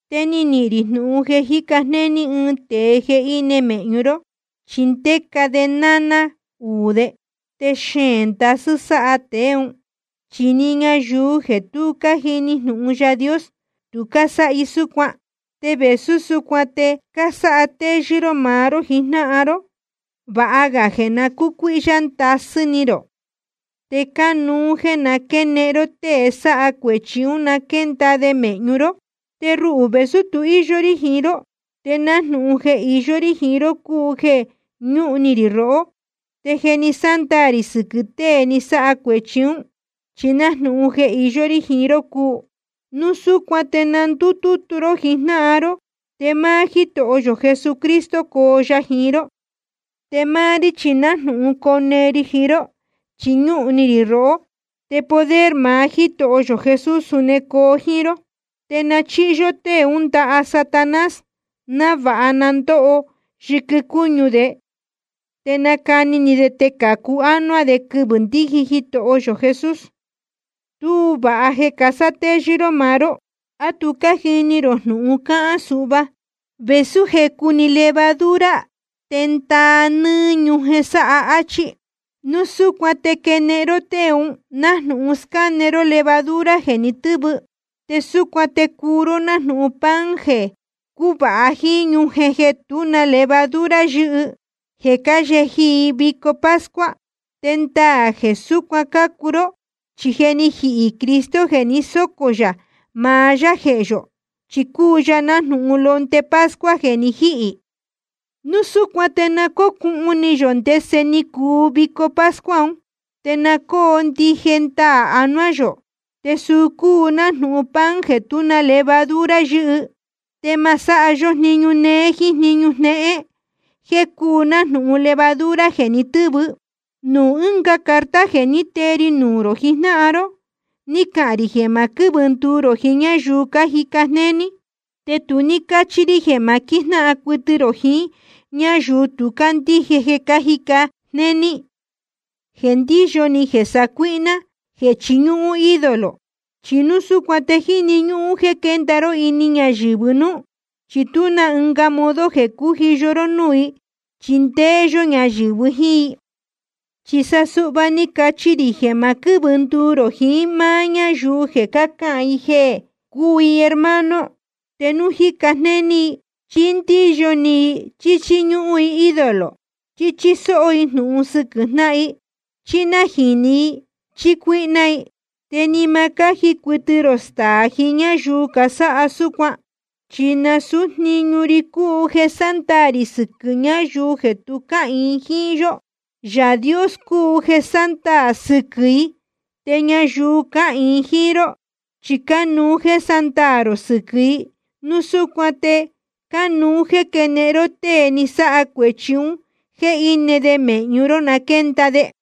Te ni nihīn rī jnūhun jeē jíca jnéní ɨɨn tēe jeē íne mēhñu ró, chi ndéca de naná uū de. Te xeēn ndasɨ́ sáha tēe ún, chi ni ñayuu jeē tu cájini jnūhun Yaā Dios, tu cásáha i súcuan. Te vēsú súcuan te cásátéyɨ́ ró maá ró jijnáhan ró. Vāha ga jeē na cúcuíhyá ndasɨ́ ni rō. Te cánuú jéē na quénehen ró tée sáha cuēchi ún na quénda de mēhñu ró. Te ruhū, vēsú tu íyó rí jiín ró, te nájnūhun jeē iyó rí jiín ró cúu jeē ñúhún ni rī rohó. Te je ni sándaā rī sɨquɨ̄ tēe ni sáha cuēchi ún, chi nájnūhun jeē iyó rí jiín ró cúu. Núu súcuan te na ndútútú ró jijnáhan ró, te máá Jítoho yō Jesucristo coo ya jiín ró. Te máá rí chi nájnūhun cone ri jiín ró, chi ñúhún ni rī rohó. Te poder maá Jítoho yō Jesús suni coo jíín ró. Te na chíhi yó tée ún ndaha Satanás, návāha na ndóho yɨquɨ cúñu de, te nacani ni de te cācu ánuá de quɨvɨ̄ ndiji Jitoho yō Jesús. Tuú vāha jeē casátéyɨ́ ró maá ró. ¿A tu cájini rō jnūhun cáhán suhva? Vēsú jecu‑ni levadura te ndáa nɨ́ɨ́ ñujen sáha, áchí. Núu súcuan te quenehen ró tée un nájnūhun scáne ró levadura jeē ni tɨ́vɨ. Te súcuan te cuu ró nájnūhun pan jeē cúvāha jíín ñujen jéé jéē tú na levadura yɨ́hɨ, jeē cáyeji i vico pascua. Te ndaā jeē súcuan cácuu ró. Chi je ni jihī Cristo jeē ni sócō yā maá yá jehē yō, chi cúu ya nájnūhun londe pascua jeē ni jíhī. Núu súcuan te na cócūhun ni yō ndese ni cuu vico pascua un, te na cóo ndije ndaā anuá yō, te suu cúu nájnūhun pan jeē tú na levadura yɨ́hɨ. Te ma sáha yó jniñu néé jíín jniñu jnéhén, jeē cúu nájnūhun levadura jeē ni tɨ́vɨ. Nuū ɨnga carta jeē ní tee ri nuū rō jijnáhan ró ni cahān rī jeē ma quɨ́vɨ nduu rō jiín ñáyuu cájica jnéní. Te tu ní cáchi rī jeē ma quíjnáhan cuɨtɨ rō jiín ñáyuu tu cácandíje jeē cájica jnéní, jeē ndíyo ni, jeē sácuíhná, jeē chiñúhún ídolo. Chi núu súcuan te jíni ñúhún jeē quénda ró ini ñayɨ̄vɨ núú, chi tuá na ɨnga modo jeē cújiyo ró núū i chi ndéé yó ñayɨ̄vɨ jíín i. Chi sa suhva ni cachi rī jeē ma quɨ́vɨ nduu rō jiín máá ñáyuu jeē cácahān i jeē cúu i hermano, te núu jíca jnéní i, chí ndíyo ni i, chí chíñúhún i ídolo, chí chísó jnúhun i sɨquɨ̄ jnáhan i, chí nájīni i, chí cuíhná i. Te ni ma cáji cuɨtɨ rō staā jiín ñáyuu casáha súcuan. Chi nasūú jniñu ri cúu jeē sándaā rī sɨquɨ̄ ñáyuu jeē tu cáhīin jíín yó. Yaā Dios cúu jeē sándaā sɨquɨ̄ i. Te ñayuu cáhīin jíín ró chi cánuú jéē sándaā rō sɨquɨ̄ i. Núu súcuan te cánuú jéē quénehen ró tée ni sáha cuēchi un jéē íne de mēhñu ró, na quénda de.